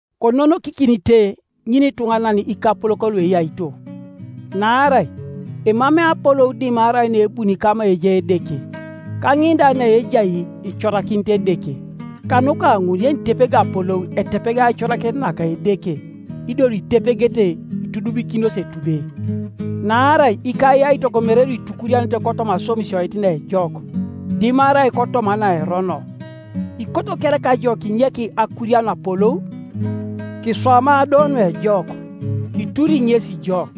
Kononokikinite ŋinituŋanan ikapolok lueyaito, naarai emamei apolou dimarai naebuni kama ejai Edeke, ka ŋin da naejai icorakinit Edeke. Kanuka ŋun yenitepegi apolou etepeg aicorakinet naka Edeke, ido luitepegete itudumikinos etube. Naarai ikayaitok mere luitukurianete kotoma aswamisioit naejok, dimarai kotoma naerono. Ikoto kereka ijo kinyek akurian apolou? Kiswama do nuejok, kituri ŋesi jo.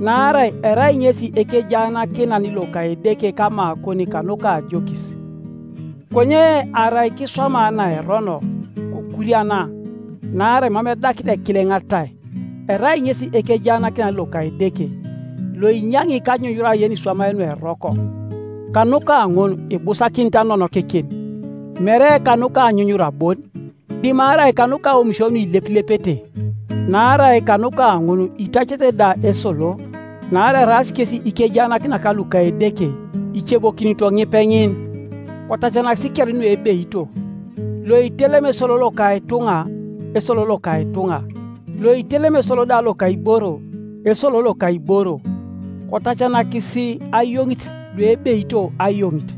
Naarai erai ŋesi ekejaanakinan loka Edeke kamakon kanuka ajokis, Konye arai kiswama naerono, kokuriana, naarai mam edakit ekileŋ atai; erai ŋesi ekejaanakinan loka Edeke, loinyaŋi kanyunyura yeniswamai nueroko. Kanuka ŋun ibusakinit anonokikin, mere kanuka anyunyura bon, dimarai kanuka aomisio nuilepilepete. Naarai kanuka ŋun itacete da esolo, naarai eraas kesi ikejaanakinak luka Edeke, icebokinito ŋipeŋin. Kotacanakisi kere nuebeito, loitelemi esolo loka ituŋa, esolo loka ituŋa; loitelemi esolo da loka iboro, esolo loka iboro; kotacanakisi ayoŋit luebeito ayoŋit,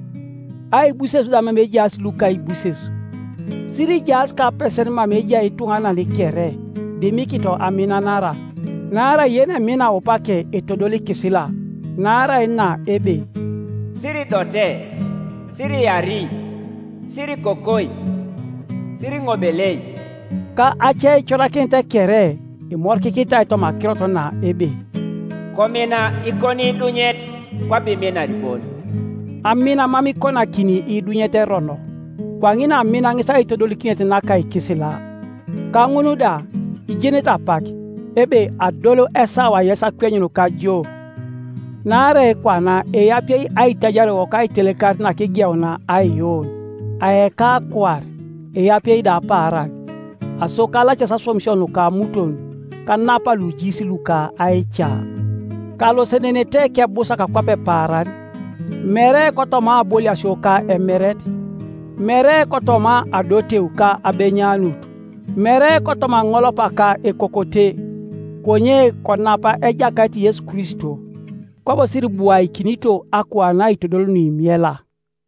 aibuses da mama ejaas lukaibuses. Sirijaas kapesen mama ejai ituŋanan kere, dimikito aminanara; naarai yenemina aupake etodol ikisila. Naarai na ebe, “Siridote, Siriari, Sirikokoi, Siriŋobelei,” ka aceicorakinet kere, imorikikinitai toma akirot na ebe, “Komina ikoniidunyet kwape iminar bon.” Amin mam ikonakini iidunyet erono; kwaŋin amin ŋes aitodolikinet naka ikisila. Ka ŋun da, ijenete apak, ebe adol esawa yes akwenyun kajoo. Naarai kwana eapie aitajariowok aitelekarit nakigeunia aiyuun; aeka akuar, eapie da apaaran. Aso kalacasi aswamisio nuka amuton, kanapa lujiis luka aica. Kalosenenete kebusak kwape paaran, mere kotoma aboliasio ka emeret, mere kotoma adoteu ka abenyanut, mere kotoma aŋolopa ka ekokote, konye konapa Ejakait Yesu Kristo, kwabo siribuakinito akuan aitodol nuimiela.